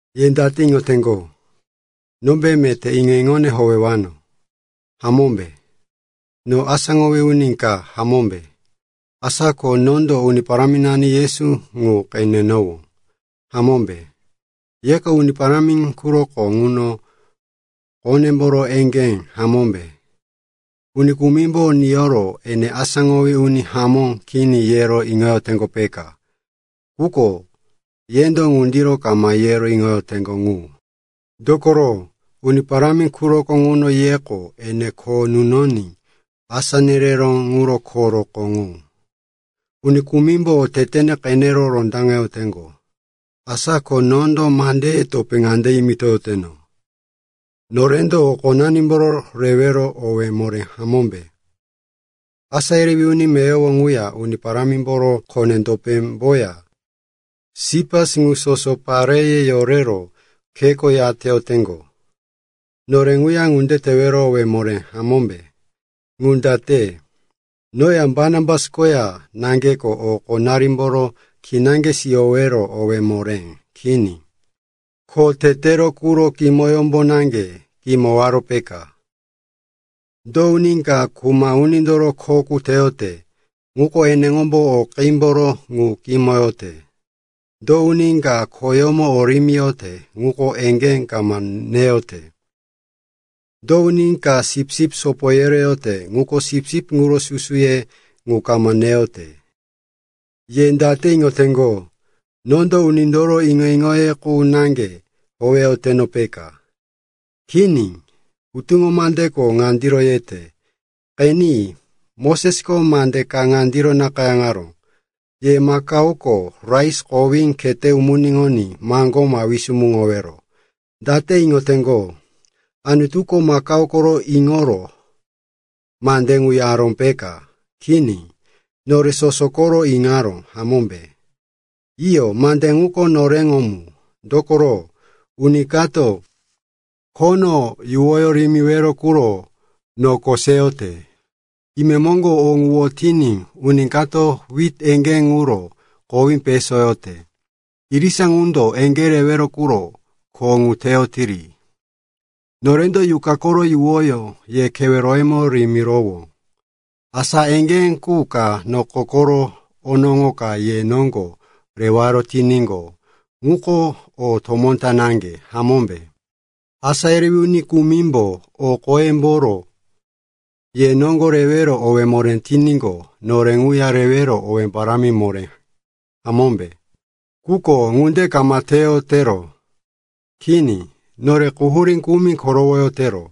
Ye date iŋoteŋgo? Nombe meté iŋo-iŋone howewano, hamómbe? Noko asáŋowí uni ka, hamómbe? Asa ko nondo Uni Paráminani Yesu ŋu qenenowó, hamómbe? Yeko Uni Parámi quroko ŋuno khonemboro eŋgé, hamómbe? Uni kumimbo niyoro, ene asáŋowí uni hamó kini, yero iŋoteŋgo, peka. Quko yendo ŋundiro kama yero iŋoyoteŋgo ŋu. Dokoro Uni Parámi quroko ŋuno yeko ene kho nunoní asá nereró ŋuro rokó ŋu. Uni kumimbo otetene qene rondaŋeyoteŋgo. Asa ko nondo mandeye topé ŋande yimitoyoteno. Norendo o qonanimboro rewero owé moré, hamómbe? Asá yerewí uni meyowo ŋuya Uni Parámimboro kone-topémboya Sipas, ŋu soso pareye yorero kheko yateyoteŋgo. Nore ŋuya ŋunde tewero owé moré, hamómbe? Ŋu date? Noya Barnabas koya naŋgeko o qonarimboro kinaŋge siyowero owé moré kini, kho tetero quro kimoyómbo naŋge kimowaro, peka? Do uni ka kuma unindoro kho qu teyote ŋuko eneŋombo o qímboro ŋu kimoyote? Do uni ka khoyómo o rimiyote ŋuko eŋgé kama neyote? Do uni ka sipsip sopo yereyote ŋuko sipsip ŋuro susuye ŋu kama neyote? Ye date iŋoteŋgo, nondo unindoro iŋo-iŋo qu naŋge howeyoteno, peka? Kini, hutuŋo mandeko ŋundiro yete. Qeni, Mosesko mande ka ŋandiro nakayáŋaró, “Ye makaoko rais kowí khete umuniŋoní maŋgó ma wisumuŋowero.” Date iŋoteŋgo, Anutuko makao koro iŋoro mande ŋu yaró, peka? Kini. Nore soso koro iŋaró, hamómbe? Iyo, mande ŋuko noreŋo mu. Dokoro uni kato khono yuwoyó rimiwero quro noko seyote, imemoŋgo o ŋu wotiní uni kato wit eŋgé ŋuro kowí pesoyote, irisa ŋundo eŋgé rewero quro kho ŋu teyotiri. Norendo yuqa koro yuwoyó ye keweroyemo rimirowó. Asa eŋgé qu ka noko koro onoŋo ka ye noŋgo rewaro tiníqo, ŋuko o tomó naŋge, hamómbe? Asá yerewí uni kumimbo o qoyemboro ye noŋgo rewero owé moré tiníqo, nore ŋuya rewero owé parámi moré, hamómbe? Quko ŋunde kama teyotero. Kini, nore quhurí kumi korowoyotero,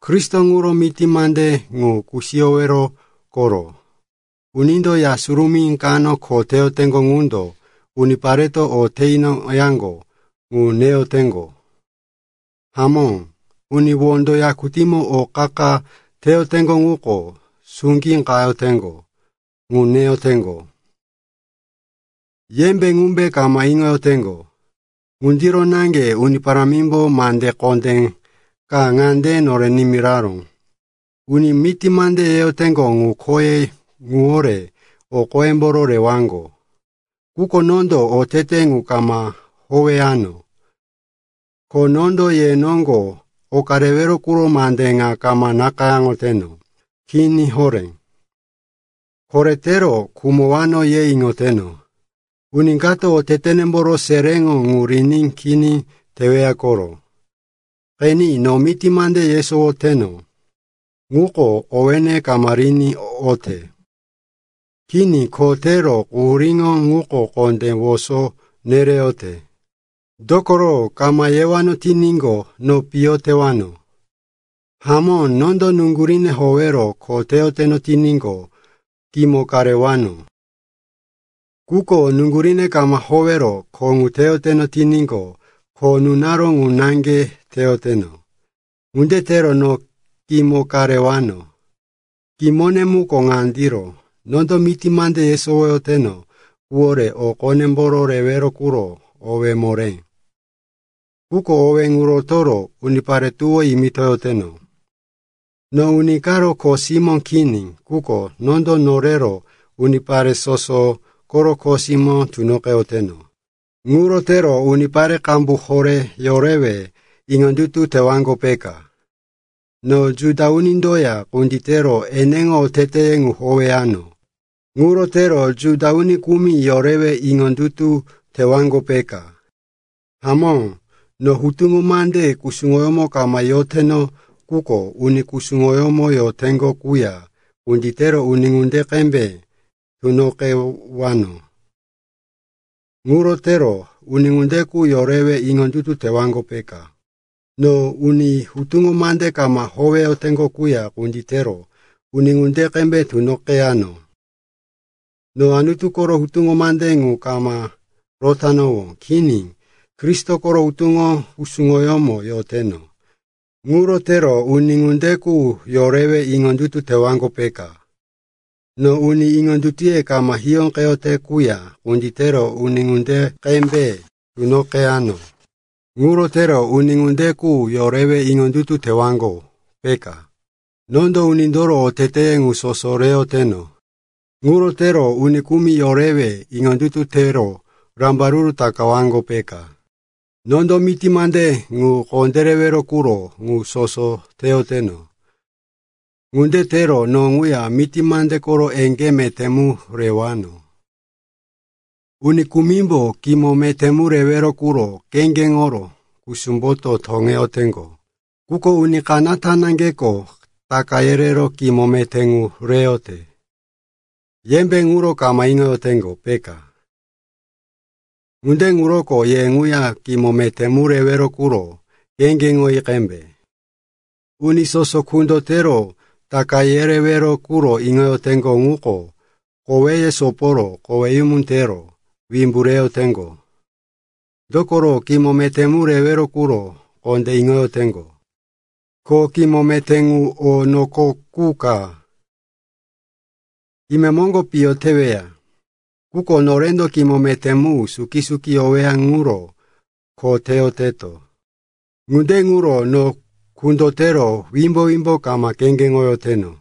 Kristo ŋuro miti mande ŋu kusiyowero koro. Unindo ya surumí kano kho teyoteŋgo ŋundo unipareto o te inoyaŋgo ŋu neyoteŋgo. Hamó, uni wondo yakutímo o qa-qa teyoteŋgo ŋuko suŋgí qayoteŋgo ŋu neyoteŋgo. Yembe ŋumbe kama iŋoyoteŋgo? Ŋundiro naŋge Uni Parámimbo mande kondé ka ŋande nore nimiraró, uni miti mande yeyoteŋgo ŋu khoye ŋuwore o qoyemboro rewaŋgo. Quko nondo otete ŋu kama howeyano. Ko nondo ye noŋgo oka rewero quro mande ŋa kama nakayáŋoteno. Kini horé. Koretero khumowano, ye iŋoteno. Uni kato otetenemboro seréŋo ŋu riní kini teweya koro. Qeni, no miti mande yesowoyoteno ŋuko owéne kama riní oyote. Kini, kho tewero quhuríŋo ŋuko kondé woso nereyote, dokoro kama yewano tiníqo, no piyo tewano. Hamó, nondo nuŋguríne howero kho teyoteno tiníqo, kimo ka rewano. Quko nuŋguríne kama howero kho ŋu teyoteno tiníqo, kho nunaró ŋu naŋge teyoteno. Ŋunde tero do kimo ka rewano? Kimone muko ŋandiro: nondo miti mande yeyoteno quwore o qonemboro rewero quro owé moré. Quko owé ŋu rotoro unipare tuwó yimitoyoteno. No uni karo kho simó kini, quko nondo norero unipare soso koro kho simó tunoqeyoteno. Ŋuro tero unipare qambu horé yorewe iŋondutu tewaŋgo, peka. No Juda unindoya kunditero eneŋo oteteye ŋu howeyano. Ŋuro tero Juda uni kumi yorewe iŋondutu tewaŋgo, peka. Hamó, no hutuŋo mande kusuŋoyómo kama yoteno, quko uni kusuŋoyómo yoteŋgo quya kunditero uni ŋunde qembe tunoqeyano. Ŋuro tero uni ŋunde qu yorewe iŋondutu tewaŋgo, peka. No uni hutuŋo mande kama howeyoteŋgo quya kunditero uni ŋunde qembe tunoqeyano. (No Anutu koro hutuŋo mande ŋu kama rotanowó. Kini, Kristo koro hutuŋo kusuŋoyómo yoteno.) Ŋuro tero uni ŋunde qu yorewe iŋondutu tewaŋgo, peka. No uni iŋondutuye kama hiyóqeyote quya kunditero uni ŋunde qembe tunoqeyano. Ŋuro tero uni ŋunde qu yorewe iŋondutu tewaŋgo, peka. Nondo unindoro oteteye ŋu soso reyoteno. Ŋuro tero uni kumi yorewe iŋondutu tero rambaruru takawaŋgo, peka. Nondo miti mande ŋu kondérewero quro ŋu soso teyoteno. Ŋunde tero no ŋuya miti mande koro eŋgé meté mu rewano. Uni kumimbo kimo meté mu rewero quro kheŋgeŋoro kusumboto teyoteŋgo, quko uni kanata naŋgeko taka yerero kimo meté ŋu reyote. Yembe ŋuro kama iŋoyoteŋgo, peka? Ŋunde ŋuroko ye ŋuya kimo meté mu rewero quro kheŋgeŋoyi qembe. Uni soso kundotero taka yerewero quro iŋoyoteŋgo ŋuko koweye soporo koweyumu tero wimbu reyoteŋgo. Dokoro kimo meté mu rewero quro kondé iŋoyoteŋgo. Ko kimo meté ŋu o noko qu ka; imemoŋgo piyo teweya. Quko norendo kimo meté mu suki-suki yoweya ŋuro kho teyoteto. Ŋunde ŋuro no kundotero wimbo-wimbo kama kheŋgeŋoyoteno.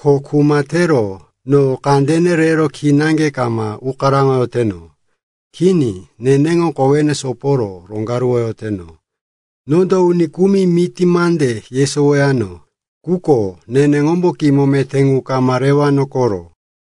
Ko kuma tero no kandene rero kinaŋge kama ukaraŋoyoteno. Kini. Neneŋo kowene soporo roŋgaruwoyoteno. Nondo uni kumi miti mande yesowowano, quko neneŋombo kimo meté ŋu kama rewano koro.